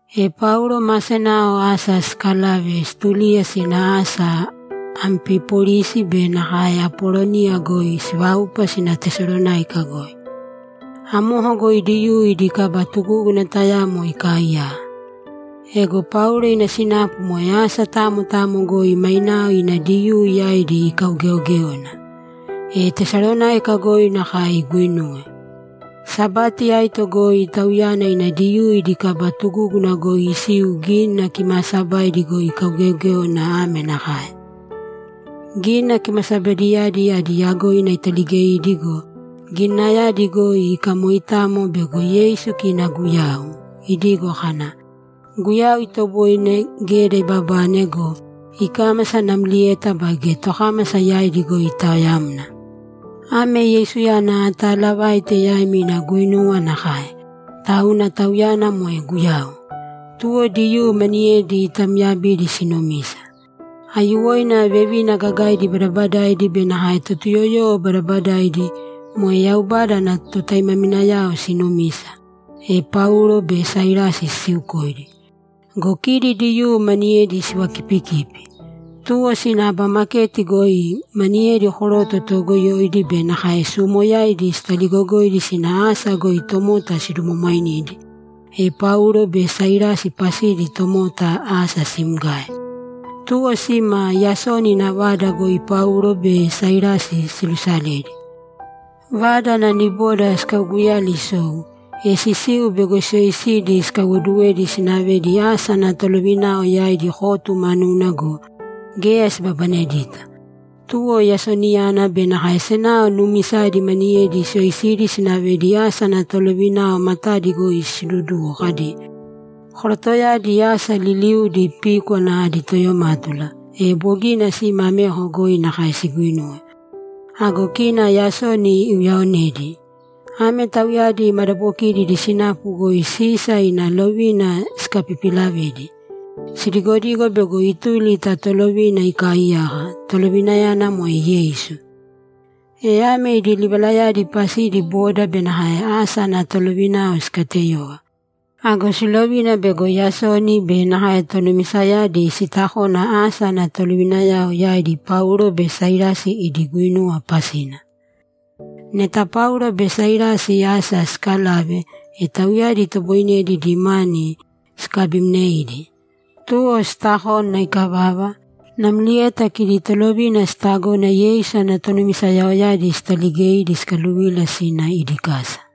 E Paulo ma senao asa sikalave, situliya sina asa Ampipolisi be nakae Apoloniya goi siváupa sina Tesalonáika goi. Amoko goi Diyuu idi kaba tugúguna tayamo ikaaiyaka. Ego Paulo ina sinapu moe asa tamo tamo goi mainao ina Diyuu yaidi ikaugeogéona. E Tesalonáika goi nakae iguinuwe. Sabati aito goi tauyana ina Diyuu idi kaba tugúguna goi isiu Gínina Kimaasabaidi goi ikaugeogéona ame nakae: Gínina Kimasabaidiyadi adi yagoina italigeidi go, Gininayadi goi ikamoitamo bego Yeisu kina Guyau, idigo kana, ‘Guyau itoboine geda ibabane go, ikámasa namlieta baige tokámasa yaidi goi itaoyamna. Ame Yeisuyana ataalavaite yaimi ina guinuwa nakae, tauna Tauyana moe Guyau.’ Tuwo Diyuu maniyedi itamyabidi sinumisa. Aiyuwoina vevina gagaidi badabadaidi be nakae Totuyoyowo badabadaidi, moe Yaubada ana totaimaminayao, sinumisa, e Paulo be Sailasi sisiukoidi. Go kidi Diyuu maniyedi sivakipikipi. Tuwo sina aba maketi goi maniyedi koroto toogoyoidi be nakae suumoyaidi sitaligogoidi sina asa goi tomota sidumwamwainidi, e Paulo be Sailasi pasidi tomota asa simgae. Tuwo sima Yasoni ina vada goi Paulo be Sailasi silusaledi. Vada ana niboda sikauguyali isou, e sisiu bego siyoisidi sikaiwoduwedi sinavedi asa ana tolovinao yaidi kotu manuna go, geya sibabanedita. Tuwo Yasoniyana be nakae senao nuumisaidi maniyedi siyoisidi sinavedi asa ana tolovinao matadi goi siduduwo kadi, ‘Korotoyadi asa liliudi píkwana adi toyomátula, e bogina sima ameko goi nakae siguinuwe. Ago kina Yasoni iuyaonedi! Ame tauyadi madabokidi idi sinapu goi Sisa ina lovina sikapipilavedi. Sidigodigo bego ituli ta tolovina ikaaiyaka, tolovinayana moe Yeisu.’ E ame idi livalayadi pasidi boda be nakae asa ana tolovinao sikateyova. Ago silovina bego Yasoni be nakae tonumisayadi sitakona asa ana tolovinayao yaidi Paulo be Sailasi idi guinuwa pasina. Neta Paulo be Sailasi asa sikalave, e tauyadi itoboinedi idi mani sikabimneidi. Tuwo sitakona ikavava, namlieta kidi tolovina sitagona Yeisu ana tonumisayaoyadi sitaligeidi sikaluvila sina idi kasa.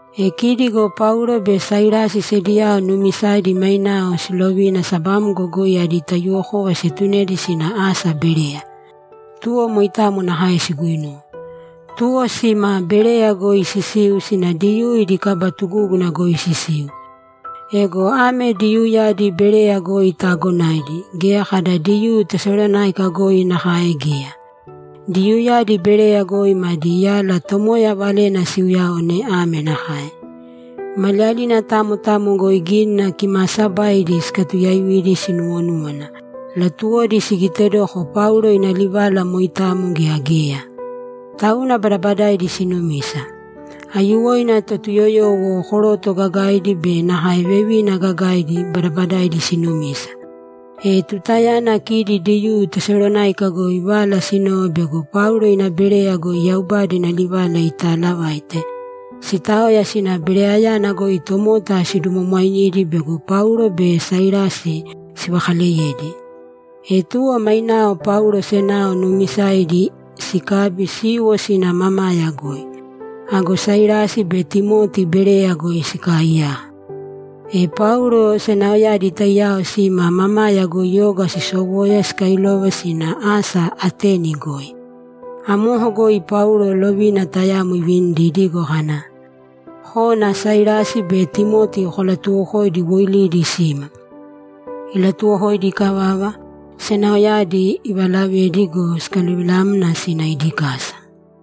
E kidi go Paulo be Sailasi sediyao nuumisaidi mainao silovina sabamgo goi adi taiyuwokova sietunedi sina asa Bereya. Tuwo moitamo nakae siguinuwe. Tuwo sima Bereya goi sisiu sina Diyuu idi kaba tugúguna goi sisiu. Ego ame Diyuuyadi Bereya goi taagonaidi; geya kada Diyuu Tesalonáika goi nakae geya. Diyuuyadi Bereya goi madi yala Tomoya Valena siuyaone ame nakae: Maliyalina tamo tamo goi Gínina Kimaasabaidi sikatuyaaividi sinuwonúwana; latuwodi sigitedoko Paulo ina livala moitamo gea geya. Tauna badabadaidi sinumisa. Aiyuwoina Totuyoyowo, koroto gagaidi be nakae vevina gagaidi, badabadaidi sinumisa. E tutayana kidi Diyuu Tesalonáika goi vala sinove bego Paulo ina Bereya goi Yaubada ina livala itaalavaite, sitaoya sina Bereyayana goi tomota sidumwamwainidi bego Paulo be Sailasi sivakaleyedi. E tuwo mainao Paulo senao nuumisaidi sikabi siiwo sina mamaya goi. Ago Sailasi be Timoti Bereya goi sikaaiyaka. E Paulo senaoyadi taiyao sima mamaya goi oga sisowoya sikailova sina asa Ateni goi. Amoko goi Paulo lovina tayamo ivinidi idigo kana, ‘Kōna Sailasi be Timoti kolatuwokōidi woilidi sima.’ Ilatuwokoidi ikavava, senaoyadi ivalavedi go, sikaluvilamna sina idi kasa.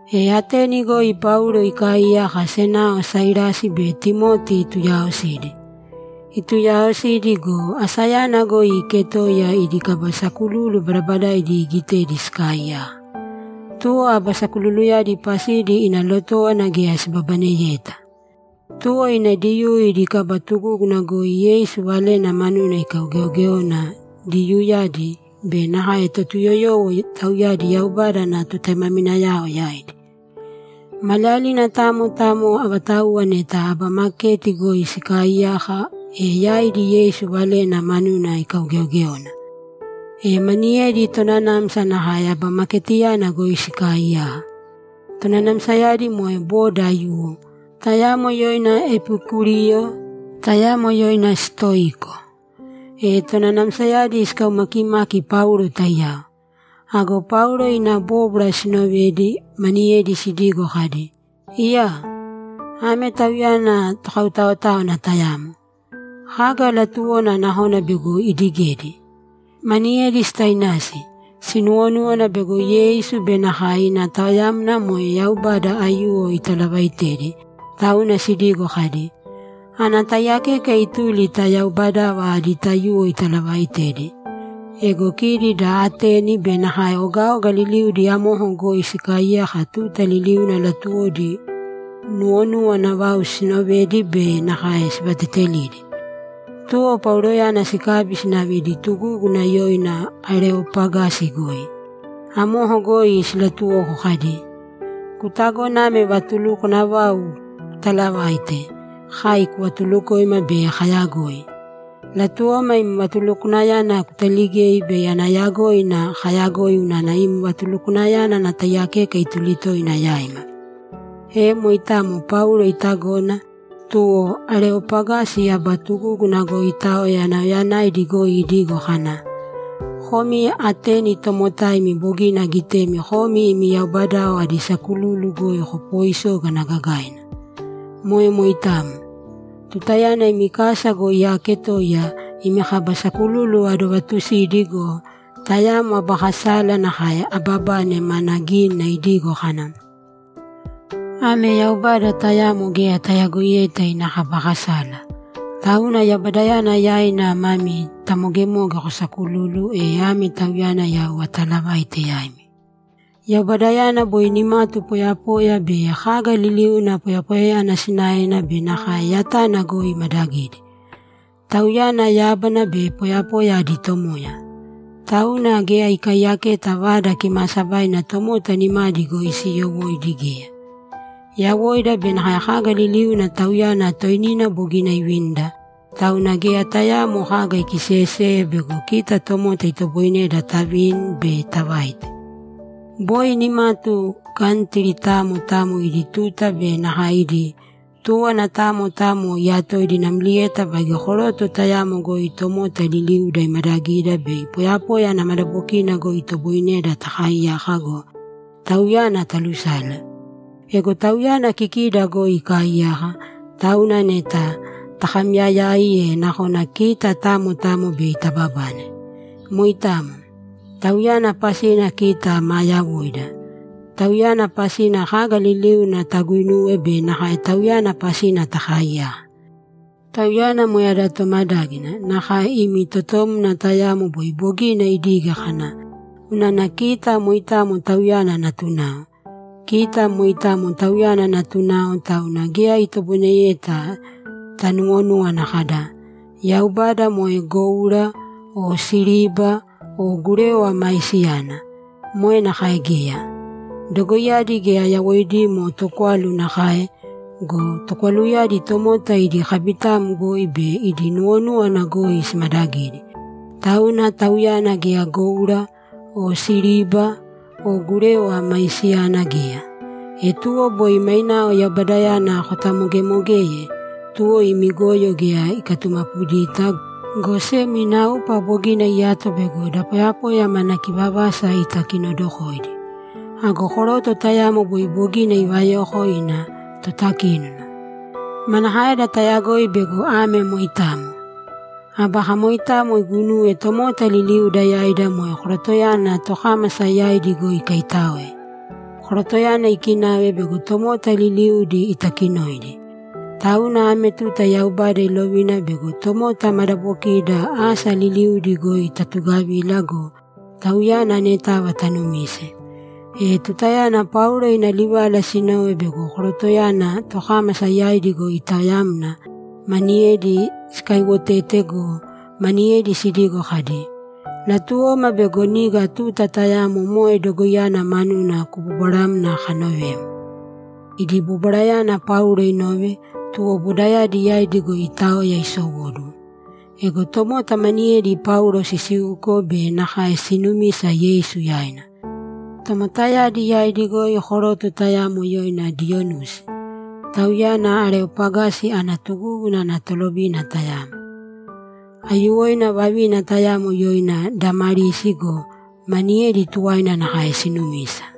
E Ateni goi Paulo ikaaiyaka senao Sailasi be Timoti ituuyaosidi. Ituuyaosidi go, asayana goi iiketoiya idi kaba sakululu badabadaaidi iigitedi sikaaiyaka. Tuwo aba sakululuyadi pasidi ina lotówana geya sibabaneyeta. Tuwo ina Diyuu idi kaba tugúguna goi Yeisu Valena manuna ikaugeogéona Diyuuyadi be nakae Totuyoyowo, tauyadi Yaubada ana totaimaminayao, yaidi. Maliyalina tamo tamo avatauwa neta aba maketi goi sikaaiyaka, e yaidi Yeisu Valena manuna ikaugeogéona. E maniyedi tonanamsa nakae aba maketiyana goi sikaaiyaka. Tonanamsayadi moe boda aiyuwo, tayamo yoina Epikuriyo, tayamo yoina Sitoiko. E tonanamsayadi sikaumakimaki Paulo taiyao. Ago Paulo ina bóbwara sinovedi, maniyedi sidigo kadi, ‘Iyaa! Ame tauyana tokautaotáwana tayamo. Kaga latuwona nakona bego idigedi?’ Maniyedi sitainasi; sinuwonúwana bego Yeisu be nakae ina taoyamna moe yaubada aiyuwo italavaitedi, tauna sidigo kadi, ‘Ana taiyakeka ituli ta yaubadava adi taiyuwo italavaitedi.’ Ego kidi da Ateni be nakae ogaoga liliudi amoko goi sikaaiyaka tuta liliuna latuwodi nuwonuwana vau siinovedi be nakae sivateetelidi. Tuwo Pauloyana sikabi sinave idi tugúguna yoina Areopagasi goi. Amoko goi silatuwoko kadi, ‘Kutagona ame vatulukwana vau kutaalavaite, kai kuvatulukoima bei kayagoi? Latuwoma im vatulukwanayana kutaligei bei ana yagoina kayagoi unana im vatulukwanayana ana taiyakeka ituli toina yaima.’ E moitamo Paulo itagona, tuwo Areopagasi aba tugúguna goi itaoya nauyayanaidi goi idigo kana, ‘Komi Ateni tomotaimi, bogina agitemi komi imi yaubadayao adi sakululu goi kopoisógana gagaina. Moe moitamo. Tutayana imi kasa goi aaketoiya, imi kaba sakululu adovaatusidi go, tayamo aba kasala nakae ababane mana gínina idigo kana, “Ame yaubada tayamo geya tayagoiyeta ina kaba kasala.” Tauna yaubadayana yaina mami tamogemoge kosaakululu, e ame tauyana yau ataalavaite yaimi. Yaubadayana boi nimatu poyapoya be kaga liliuna poyapoyayana sinaena be nakae yatana goi imadagidi. Tauyana yábana be poyapoya adi Tomoya. Tauna geya ikaiyaketa vada kimaasabaina tomota nimadi goi siiyowóidi geya. Yawoida be nakae kaga liliuna Tauyana toinina bogina ivinida, tauna geya tayaamo kaga ikiseyeseye bego kita tomota itoboineda tavini be tavaite. Boi nimatu kantri tamo tamo idi tuta be nakae idi túwana tamo tamo iyatoidi namlieta baige koroto tayamo goi tomota liliuda imadagida bei poyapoya ana madabokina goi itoboineda takaiyaka go, Tauyana talusale. Ego Tauyana kikida goi ikaaiyaka, tauna neta takamyayai, e nakona kita tamo tamo bei tababane. Moitamo. Tauyana pasina kita maa yawoida, Tauyana pasina kaga liliuna taguuinuwe be nakae Tauyana pasina taakaiyaka. Tauyana moe ada tomadágina, nakae imi totomna tayamo boi bogina idige kana, “Unana kita moitamo Tauyana natunao.” Kita moitamo Tauyana natunao, tauna geya itoboineyeta tanuwonúwana kada, “Yaubada moe goura o siriba o gurewa maisiyana.” Moe nakae geya. Dogoiyadi geya yawoidimo tokwalu nakae go, tokwaluyadi tomota idi kabitam goi be idi nuwonúwana goi simadagidi. Tauna Tauyana geya goura o siriba o gurewa maisiyana geya. E tuwo boi mainao Yaubadayana kotamogemogeye, tuwo imi goyo geya ikatumapudita, go sem ina upa bogina iyato bego da poyapoya mana kivavasa itakinodokoidi. Ago koroto tayamo boi bogina ivayoko ina totakínona. Manakaeda tayagoi bego ame moitamo? Aba kamoitamo iguinuwe tomota liliuda yaida moe korotoyana tokámasa yaidi goi ikaitáoe. Korotoyana ikinave bego tomota liliudi itakinoidi. Tauna ame tuta Yaubada ilovina bego tomota madabokida asa liliudi goi tatugavīla go, Tauyana anetava tanumīse.’ E tutayana Paulo ina livala sinove bego korotoyana tokámasa yaidi goi itaoyamna, maniyedi sikaiwotete go, maniyedi sidigo kadi, ‘Latuwoma bego niga tuta tayamo moe dogoiyana manuna kubobwaramna kanovem.’ Idi bobwarayana Paulo inove, tuwo bodayadi yaidi goi itaoya isowóduwo. Ego tomota maniyedi Paulo sisiuko be nakae sinumisa Yeisu yaina. Tomotayadi yaidi goi koroto tayamo yoina Diyonusi, tauyana Areopagasi ana tugúguna ana tolovina tayamo. Aiyuwoina vavina tayamo yoina Damarisi go, maniyedi tuwaina nakae sinumisa.